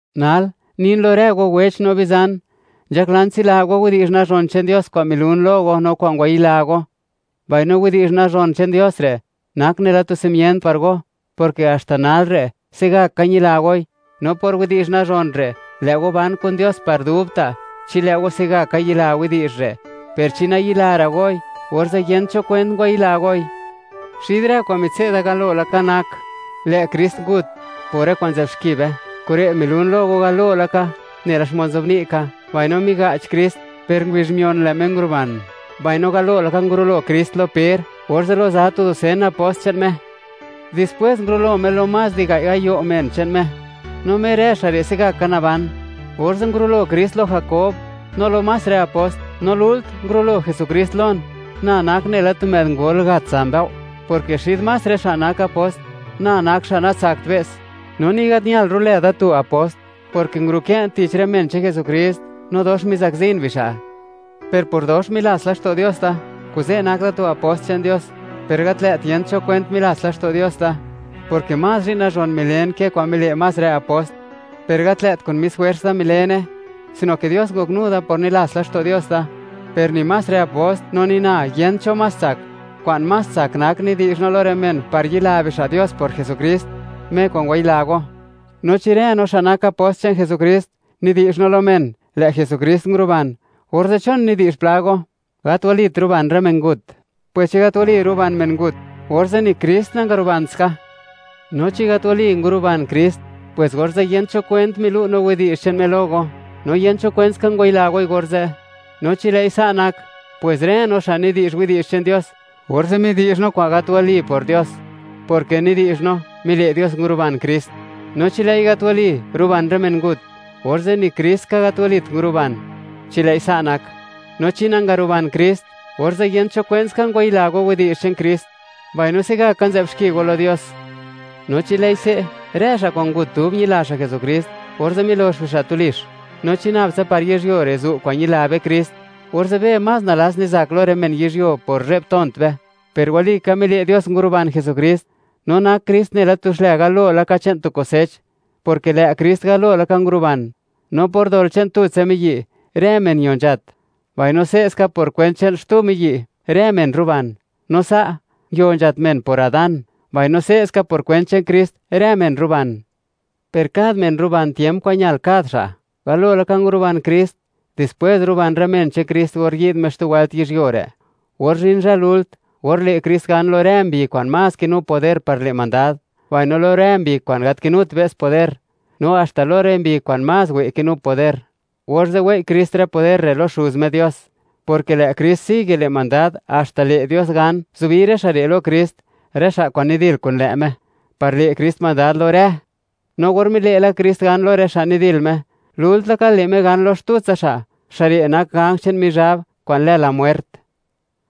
Nal, nin lo rë go wech no bizan; nzhaklan tsila go widi'zh nazhon che'n Dios kwa'n milun lo go, no kwa'n ngwayila go, mbaino widi'zh nazhon che'n Dios re', nak nela tu simient par go, porke haxta nal re', se'gaka ñila goi, no por widi'zh nazhon re', lë' go ban kun Dios par dubta', chi lë' go se'gaka yila widi'zh re'; per chi nayilara' goi, orze' yent cho kwent ngwayila goi. Xid rë kwa'n mitse'da galo laka, nak, lë' Krist ngut por rë kwa'n nzë'b xki be. Kure' milun lo go galo laka, nela xmod nzobni' ka, mbaino miga'ch Krist, per ngubizh mion, lë' Me nguru'ban, mbaino galo laka ngurulo Krist lo Per, orze' lo za tu dusen apost che'n Me; dispwes ngurulo Me lo más di gai' gayo' men che'n Me; no mer rë xa' re' se'gaka naban. Orze' ngurulo Krist lo Jakob, no lo más rë apost. No lult, ngurulo Jesukrist lon, na nak nela tu më'd ngol gat za mbëo', porke xid más rë xa' nak apost, na nak xa' natsakt be's, no ni gat ñal ru'lë da tu apost, porke nguru'kë'n tich rë men che'n Jesukrist, no dox mizakzin bixa'. Per por dox milats laxto' Dios da, kuze' nak da tu apost che'n Dios, per gat lë't yent cho kwent milats laxto' Dios da, porke más zhi'n nazhon milen ke kwa'n mile' más rë apost, per gat lë't kun mis jwers da milene, sino ke Dios ngoknu da por nilats laxto' Dios da. Per ni más rë apost, no ni na, yent cho más tsak. Kwa'n más tsak nak, nidi'zh no lo rë men, par yila bixa' Dios por Jesukrist, Me kwa'n ngwayila go. No chi rë no, xa' nak apost che'n Jesukrist, nidi'zh no lo men, lë' Jesukrist nguruban, orze', ¿chon nidi'zh pla go: “Gat walit ruban rë men ngut”? Pwes chi gat wali, ruban men ngut, orze', ni Krist nangarubant ska, no chi gat wali, nangarubant Krist, pwes orze' yent cho kwent milu' no widi'zh che'n Me lo go, no yent cho kwentska ngwayila goi orze'. No chi lë'i sa' nak, pwes rë no, xa' nidi'zh widi'zh che'n Dios, orze' midi'zh no kwa'n gat wali por Dios, porke nidi'zh no, mile' Dios, nguruban Krist. No chi lë'i gat wali, ruban rë men ngut, orze' ni Kristska gat walit nguruban, chi lë'i sa' nak. No chi nangaruban Krist, orze' yent cho kwentska ngwayila go widi'zh che'n Krist, mbaino se'gaka nzë'b xki go lo Dios. No chi lë'i se', rë xa' kwa'n ngut, dub ñila xa' Jesukrist, orze' milox bixa' tulix. No chi nab tsa par yizhyuo re' zu' kwa'n ñila be Krist, orze' be más nalats nizak lo rë men yizhyuo por zhe'b tont be. Per walika, mile' Dios nguruban Jesukrist, no nak Krist nela tu xlë galo laka che'n tu kusech, porke lë' Krist galo laka nguruban. No por dol che'n tutsa miyi', rë men ño nzhat, mbaino se'ska por kwent che'n xtuska miyi', rë men ruban. No sa', nguio nzhat men, por Adán, mbaino se'ska por kwent che'n Krist, rë men ruban. Per kad men ruban tiemp kwa'n ñal kad xa': Galo laka nguruban Krist, dispwes ruban rë men che'n Krist, or yi'd Me xtu wëlt yizhyuo re'. Or zhin zhë lult, or le' Krist gan lo rë mbi kwa'n más kinu poder par le' mandad, mbaino lo rë mbi kwa'n gat kinut be's poder, no haxta lo rë mbi kwa'n más wë' kinu poder; orze' wei' Krist rë poder re' lo Xuz Me Dios, porke lë' Krist sigue le' mandad, haxta le' Dios gan, zubi rë xa' re' lo Krist, rë xa' kwa'n nidil kun lë' Me, par le' Krist mandad lo rë. No or mile' la Krist gan lo rë xa' nidil Me, lult laka le' Me gan lo xtutsa xa', xa' re' nak ganj che'n Mizhab kwa'n lë La Muert.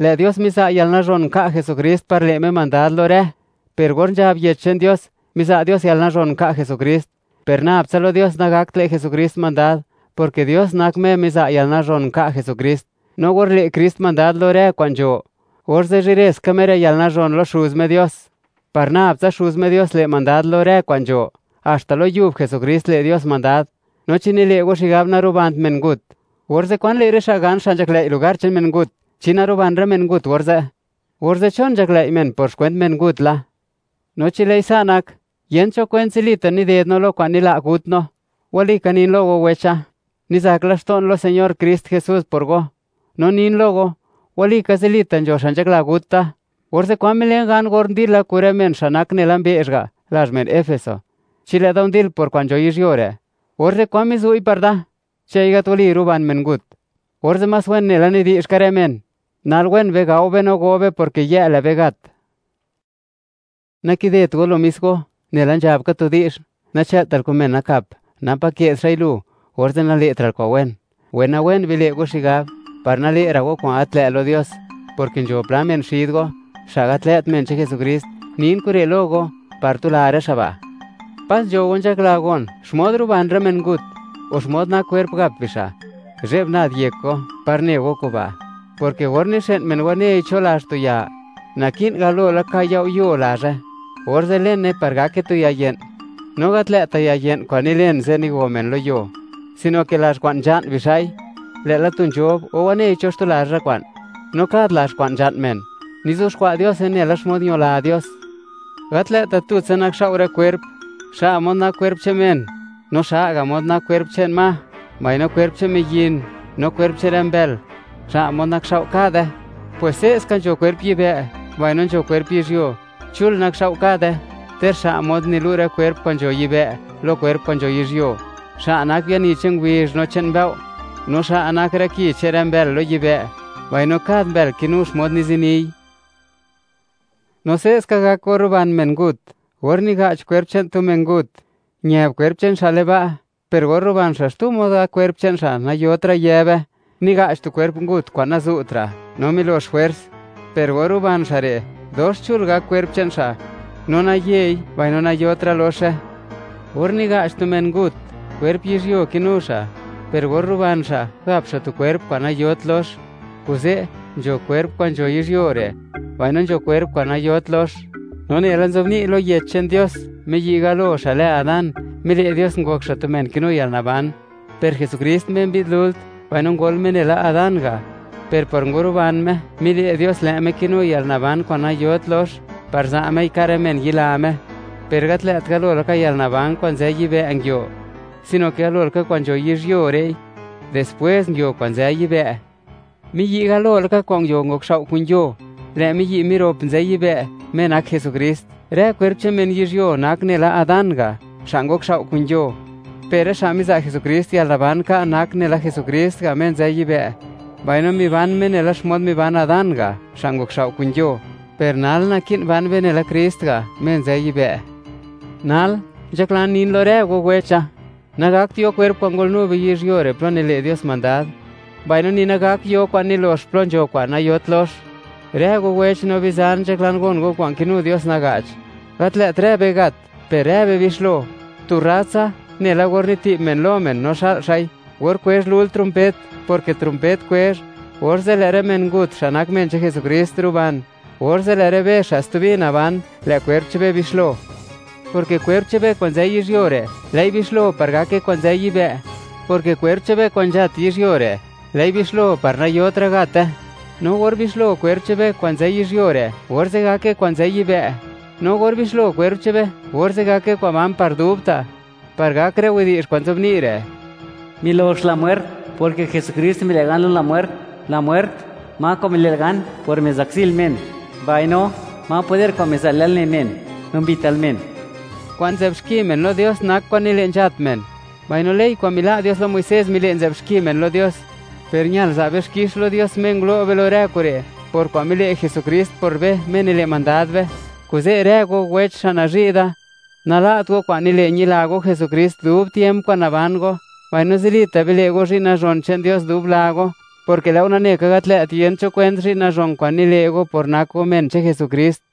Lë' Dios miza' yalnazhon nka' Jesukrist par le' Me mandad lo rë. Per or nzhab Yech che'n Dios: “Miza' Dios yalnazhon nka' Jesukrist”, per nab tsa lo Dios nagakt le' Jesukrist mandad, porke Dios nak Me miza' yalnazhon nka' Jesukrist. No or le' Krist mandad lo rë kwa'n nzho, orze' zhireska Me rë yalnazhon lo Xuz Me Dios, par nab tsa Xuz Me Dios le' mandad lo rë kwa'n nzho, haxta lo Yub Jesukrist, le' Dios mandad. No chi nile' go xigab, narubant men ngut, orze', ¿kwan le' rë xa' gan, xa' nzhaklëi' lugar che'n men ngut, chi naruban men ngut orze'? Orze', ¿chon nzhaklëi' men, por xkwent men ngut la? No chi lë'i sa' nak, yent cho kwent zilita' nided no lo kwa'n nila' gut no. Walika nin lo go, wecha; nizak laxto'n lo Señor Krist Jesús por go, no nin lo go, walika, zilita' nzho xa' nzhakla gut da. Orze', ¿kwan milen gan, or ndila kun rë men xa' nak nela tu mbe'zh ga' lazh men Efeso? Chi lë'da ndil por kwa'n yizhyuo re', orze', ¿kwan mizu'i par da? Chi lë'i gat wali, ruban men ngut, orze' más wen nela nidi'zh ka rë men: “Nal wen be, gao be no go be, porke yë' lë'be gat.” Nakidet go lo mis go, nela nzhab ka tu di'zh: “Nachë'ltal kun men nakap, napa ke'd xa'i lu, orze' nale'tra'l kwa'n wen.” Wenawen bile' go xigab, par nale'ra' go kwa'n gat lë' lo Dios, porke nzho pla men xid go, xa' gat lë't men che'n Jesukrist. Nin kure' lo go par tula rë xa' ba'. Pas nzho go nzhakla gon, xmod ruban rë men ngut, o xmod nak kwerp, gap bixa'. ¡Zhe'b nad yek go, par ne go kuba'!, porke or nixë'n men wanei cho lazh tu ya, naki'n galo laka yao'yo lazhe, orze' lene par gake tu yaye'n. No gat lë'ta' yaye'n kwa'n nilen ze' nigo men lo yuo, sino ke lazh kwa'n nzha'n bixa'i, lë'la tu nzhob, o wanei cho xtu lazh rë kwa'n. No kad lazh kwa'n nzha'n men, nizuxkwa' Diose nela xmod ñola Dios. Gat lë'ta' tutsa nakxao' rë kwerp. Xa' mod nak kwerp che'n men, no xa' ga' mod nak kwerp che'n ma, mbaino kwerp che'n miyin no kwerp che'n rë mbël, xa' mod nakxao' kade. Pwes se'ska nzho kwerp yibë', mbaino nzho kwerp yizhyuo; chul nakxao' kade, ter xa' mod nilu' rë kwerp kwa'n nzho yibë', lo kwerp kwa'n nzho yizhyuo. Xa' nak biani che'n ngubizh no che'n mbëo', no xa' nak rë ki che'n rë mbël lo yibë', mbaino kad mbël kinu xmod nizini. No se'ska gak or ruban men ngut. Or niga'ch kwerp che'n tu men ngut, ñëb kwerp che'n xa' le'n ba', per or ruban xa', xtu mod gak kwerp che'n xa', nayotra' yëbe. Niga'ch tu kwerp ngut kwa'n nazu'tra' no milox jwers; per or ruban xa' re', dox chul gak kwerp che'n xa', no nayei, mbaino nayotra' loxe. Or niga'ch tu men ngut, kwerp yizhyuo kinu xa', per or ruban xa', gap xa' tu kwerp kwa'n nayot lox. Kuze', nzho kwerp kwa'n nzho yizhyuo re', mbaino nzho kwerp kwa'n nayot lox. No nela nzobni' lo Yech che'n Dios, miyi' galo xa' lë Adán, mile' Dios, ngok xa' tu men kinu yalnaban; per Jesukrist, Me mbi'd lult, mbaino ngol Me nela Adán ga', per por nguruban Me, mile' Dios, lë' Me kinu yalnaban kwa'n nayot lox, par za' Mei ka' rë men yila Me. Per gat lë't galo laka yalnaban kwa'n nzë yibë' nguio, sino ke galo laka kwa'n nzho yizhyuo re'i, dispwes nguio kwa'n nzë yibë'. Miyi' galo laka kwa'n nguio, ngokxao' kun yuo; lë' miyi' mirop nzë yibë', Me nak Jesukrist. Rë kwerp che'n men yizhyuo, nak nela Adán ga', xa' ngokxao' kun yuo; per rë xa' miza' Jesukrist yalnaban ka', nak nela Jesukrist ga', Me nzë yibë'. Mbaino miban be nela xmod miban Adán ga', xa' ngokxao' kun yuo. Per nal, naki'n ban be nela Krist ga', Me nzë yibë'. Nal, nzhaklan nin lo rë go, wecha; nagakt yo kwerp kwa'n ngolnu be yizhyuo re' plo nile' Dios mandad; mbaino ni nagak yo kwa'n nilox plo nzho kwa'n nayot lox. Rë go wech no bizan, nzhaklan gon go kwa'n kinu Dios naga'ch: Gat lë't rë be gat, per rë be bixlo. Tu rrat tsa, nela or niti'b men lo men, no xa'l xa'i, or kwezh lult trompet, porke trompet kwezh, orze' lë' rë men ngut, xa' nak men che'n Jesukrist, ruban; orze' lë' rë be, xa' stubi naban, lë' kwerp che'n be bixlo, porke kwerp che'n be kwa'n nzë yizhyuo re', lë'i bixlo par gake kwa'n nzë yibë', porke kwerp che'n be kwa'n nzhat yizhyuo re', lë'i bixlo, par nayotra' gate. Mbaino or bixlo kwerp che'n be kwa'n nzë yizhyuo re', orze' gake kwa'n nzë yibë', no or bixlo kwerp che'n be, orze' gake kwa'n ban par dubta', par gak rë widi'zh kwa'n nzobni' re': Milox La Mwert, porke Jesukrist mile' gan lo La Mwert. La Mwert, ¿ma kwa'n mile'l gan, por mizakzil men? Mbaino, ¿ma poder kwa'n miza'l yalne men, no mbital men? Kwa'n nzë'b xki men lo Dios nak kwa'n nile' nzhat men, mbaino ley kwa'n mila' Dios lo Muisés mile' nzë'b xki men lo Dios. Per ñal za' be xkix lo Dios, Me ngulo' be lo rë kure', por kwa'n mile' Jesukrist por be, Me nile' mandad be. Kuze' rë go, wecha, xa' nazhi' da, nala't go kwa'n nile' ñila go Jesukrist dub tiemp kwa'n naban go, mbaino zilita' bile' go zhi'n nazhon che'n Dios dub la go, porke lë' go nane ka, gat lë't yent cho kwent zhi'n nazhon kwa'n nile' go, por nak go men che'n Jesukrist.